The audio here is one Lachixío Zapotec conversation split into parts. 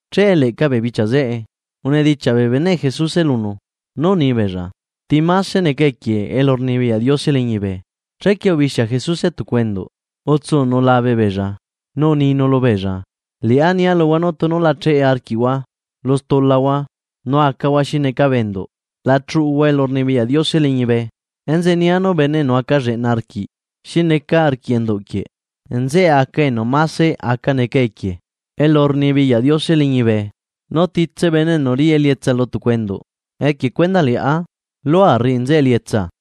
Che leꞌca bee bichia zeꞌe, unedichiaꞌ bee beneꞌ Jesuse lunu, nú unibeella: ―¿Ti máse neca equie elurnibiyaꞌ Diose liñibe? Chequie ubixia Jesuse tucu enduꞌ utsunu labe beella, nu uninu lubeella: ―Liꞌá nia luhua nú tunu la cheꞌe arquiꞌhua lu stulahua nu acahua xi neca bee enduꞌ, la chuꞌuhua elurnibiyaꞌ Diose liñibe. Enzeꞌe nia nú bene enu aca lleꞌna arquiꞌ xi neca arquiꞌ enduꞌ quieꞌ, nzeꞌe aca enu máse aca neca equie elurnibiyaꞌ Diose liñibe. Nu titse bene enu riꞌi elietsa lu tucu enduꞌ equie cuendaꞌ Liꞌá, lua rriꞌi nzeꞌe elietsa.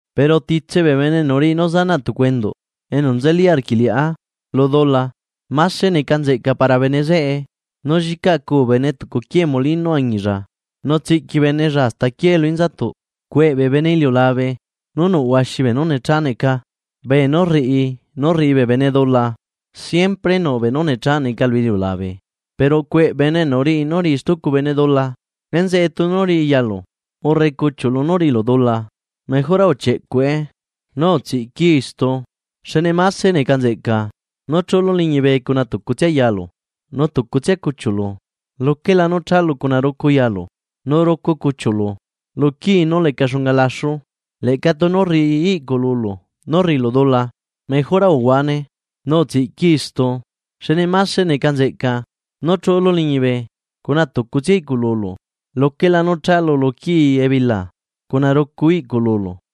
’Pero titse bee bene enu riꞌi nú zanaꞌ tucu enduꞌ enu nzeli arquiꞌ Liꞌá lu dula, máse neca nzeꞌca para bene zeꞌe nú llicaꞌcu bene tucu quie molino añilla nu tsiꞌqui benella hasta aquiee lu inzatuꞌ. ¡Cueꞌ bee bene iliulabe nú nuꞌ huaxi beenú necha neca bee nú rriꞌi nú rriꞌi bee bene dula! Siempre nuꞌbeenú necha neca lu iliulabe, pero ¡cueꞌ bene enu riꞌi nú riꞌi stucu bene dula! ’Enzeꞌe tunu riꞌi yalu urre cuchiuꞌlu nú riꞌilu dula, mejora uchieꞌcuꞌe nu utsiꞌquii istu, xne máse neca nzeꞌca nú chuꞌulu liñibe cuna tucutsia yalu nu tucutsia cuchiuꞌlu, luquela nú chalu cuna rucu yalu nu rucu cuchiuꞌlu lu quii nú leca xunga laxu. Leꞌca tunu rriꞌi iꞌcululu nú rriꞌilu dula, mejora uhuane nu utsiꞌquii istu, xne máse neca nzeꞌca nú chuꞌulu liñibe cuna tucutsia iꞌcululu, luquela nú chalu luquii ebila cuna rucu iꞌcululu.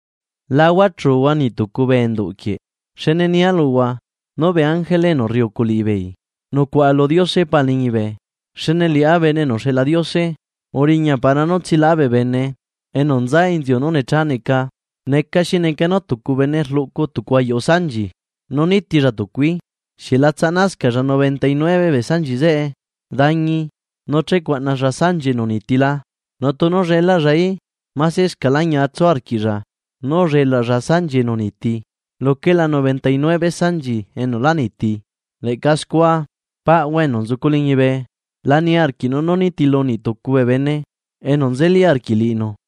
’La huachuhua niꞌ tucu bee enduꞌ quieꞌ, xne nia luhua nú bee ángele enu rriucu liꞌibeei nucuaꞌa lu Diose Pa liñibe. Xne Liꞌá Bene enu uxeꞌla Diose uriña para nú tsialaꞌá bee bene enu nza inziu nú necha neca. ’¿Neca xi neca nú tucu bene rluꞌcu tucu ayuꞌu sanchi, nu nitilla tucuí? ¿Xieꞌ la tsaꞌnascaꞌlla noventa y nueve bee sanchi zeꞌe dañi nu che cuaꞌnalla sanchi enu uniti la? Nu tunu llelaꞌllaí, masescaꞌla ñia tsu arquiꞌlla nú ullelaꞌlla sanchi enu uniti luquela noventa y nueve sanchi enu lá niti. Leꞌca scua, paꞌhua enu nzucu liñibe, la niarquiꞌnu nú nitilu niꞌ tucu bee bene enu nzeli arquiꞌ liꞌinu.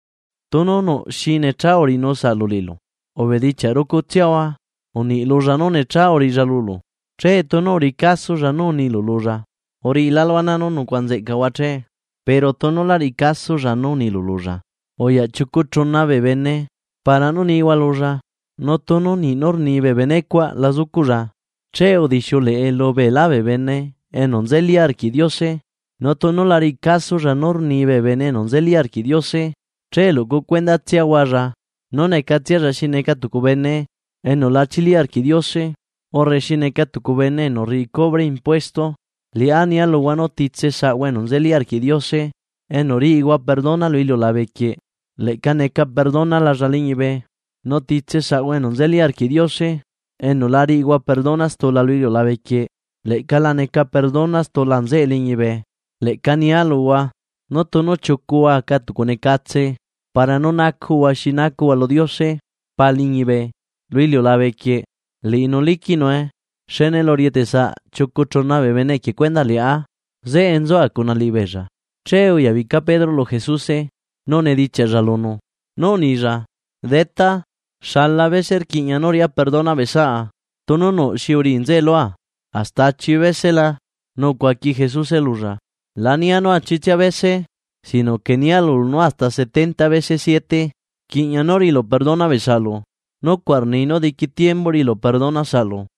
’Tunu nuꞌ xi necha uriꞌinu saꞌlu liꞌilu, ubedichiaꞌ rucutsiahua uniꞌ lulla nú necha uriꞌilla lulu. Che tunu uriꞌi casolla nú unilu lulla, uriꞌilálu ana nú nucuaꞌa nzeꞌcahua che. Pero tunu lá riꞌi casolla nú unilu lulla, uyaꞌ chiucu chuna bee bene para nú nihua lulla. Nu tunu niꞌ nú rni bee benecuaꞌ la zucuꞌlla, che udixiuleꞌe lubeelá bee bene enu nzeli arquiꞌ Diose, nu tunu la riꞌi casolla nú rni bee bene enu nzeli arquiꞌ Diose, che luꞌcu cuendatsiahualla nú necatsialla xi neca tucu bene enu la chili arquiꞌ Diose urre xi neca tucu bene enu rriꞌi cubre impuesto. ’Liꞌá nia luhua nú titse saꞌhua enu nzeli arquiꞌ Diose enu riꞌihua perdona lu iliulabequieꞌ leꞌca neca perdonalalla liñibe, nu titse saꞌhua enu nzeli arquiꞌ Diose enu la riꞌihua perdona stula lu iliulabequieꞌ leꞌca la neca perdona stula nzeꞌe liñibe. ’Leꞌca nia luhua, nú tunu chiucuhua aca tucunecatse para nú nacuꞌhua xi nacuꞌhua lu Diose Paa liñibe lu iliulabequieꞌ, liꞌinu liquiꞌnue. Xne elu rieteꞌsaꞌ chiucu chuna bee bene equie cuendaꞌ liꞌá, zeꞌe nzua cuna liꞌibeella. Che uyabica Pedro lu Jesuse nu unedichiaꞌlla lunu, nú unilla: ―Detá, ¿xala bese rquiꞌña nú riꞌá perdona bee saꞌa, tunu nuꞌ xi uriꞌi nzeꞌe lua? ¿Hasta achi bese la? Nu ucuaqui Jesuse lulla: ―La nia nú achitsia bese. Sino que nia lulu nú hasta setenta bese siete rquiꞌña nú riꞌilu perdona bee saꞌlu, nucuaꞌ rni nú diqui tiembu riꞌilu perdona saꞌlu.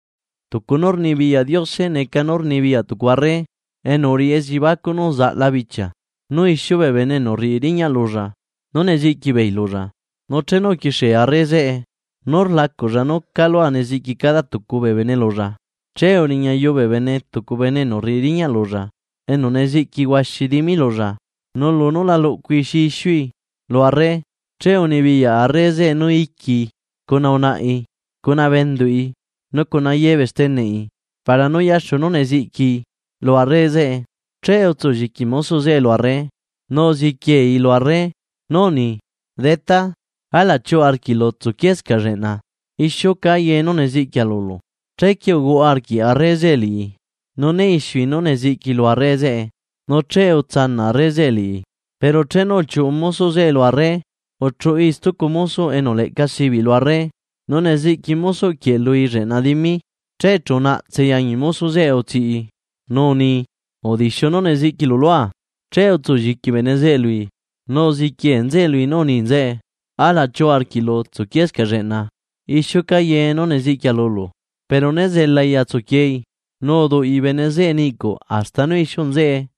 ’Tucu nú rnibiyaꞌ Diose neca nú rnibiyaꞌ tucu arre enu uriꞌi elliebacuꞌ nú uzaꞌla bichia nú ixiu bee bene enu rriꞌi riñaꞌ lulla nú neziꞌqui beei lulla. Nu chenu uquixie arre zeꞌe nú rlacuꞌlla calu neziꞌqui cada tucua bee bene lulla, che uriñayu bee bene tucu bene enu rriꞌi riñaꞌ lulla enu neziꞌqui huaxi dimi lulla. Nu lunú la luꞌcui xi ixiui lu arre. Che unibiyaꞌ arre zeꞌe nú iquii cuna unaꞌi cuna bee enduꞌi, nu cuna ye bee steneꞌi para nú yaxu nú neziꞌquii lu arre zeꞌe. Che utsulliqui mosoꞌ zeꞌe lu arre nu uziquiei lu arre, nú uni: “Detá, alaꞌ chiuꞌu arquiꞌlu tsuquiescaꞌ lleꞌna ixiuca ye nú neziꞌquia lulu.” Chequie uhuaꞌa arquiꞌ arre zeꞌe liꞌi, nu né ixiui nú neziꞌquii lu arre zeꞌe nu che utsanaꞌ arre liꞌi. Pero chenu uchiuꞌu mosoꞌ zeꞌe lu arre, uchuꞌui stucu mosoꞌ enu leꞌca sibiꞌ lu arre nu neziꞌqui mosoꞌ quieꞌ lui lleꞌna dimi. Che chu unaꞌtsei añi mosoꞌ zeꞌe utsiꞌii, nu uni: “¡Udixiu nú neziꞌquilu lua!” Che utsu lliqui bene zeꞌe lui, nu uziquie nzeꞌe lui nú uni nzeꞌe: “Alaꞌ chiuꞌu arquiꞌlu tsuquiescaꞌ lleꞌna, ixiuca ye nú neziꞌquia lulu.” Pero né zelai atsuquiei, nu uduꞌi bene zeꞌe niꞌcuꞌ hasta nú ixiu nzeꞌe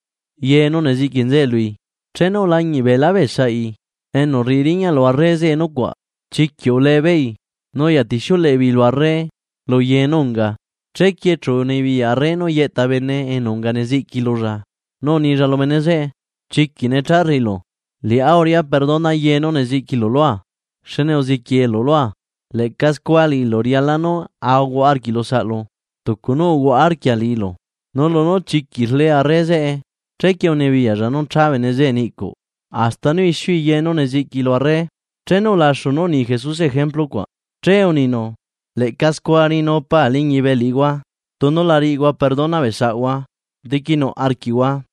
ye nú neziꞌqui nzeꞌe lui. Chenu ulañiꞌ beelá bee saꞌi enu rriꞌi riñaꞌ lu arre zeꞌe nucuaꞌ, chiquiꞌ ulebeei nu uyatixiuleꞌe beei lu arre lu ye nú unga. Chequie chu unibiyaꞌ arre nú yeꞌta bene enu unga neziꞌqui lulla, nu unilla lu bene zeꞌe: “¡Chiquiꞌ necha rriꞌilu! Liꞌá uriꞌá perdona ye nú neziꞌquilu lua, xne uziquielu lua. Leꞌca scua liꞌilu riala nú ahuaꞌa arquiꞌlu saꞌlu, tucu nú uhuaꞌa arquia liꞌilu.” Nu lunú chiquiꞌ rle arre zeꞌe, chequie unibiyaꞌlla nú cha bene zeꞌe niꞌcuꞌ hasta nú ixiui ye nú neziꞌquii lu arre. Chenu ulaxu nú uni Jesuse ejemplu cuaꞌ, che uninu: ―Leꞌca scua riꞌinu Pa liñibe liꞌihua tunu la riꞌihua perdona bee saꞌhua diquinuꞌ arquiꞌhua.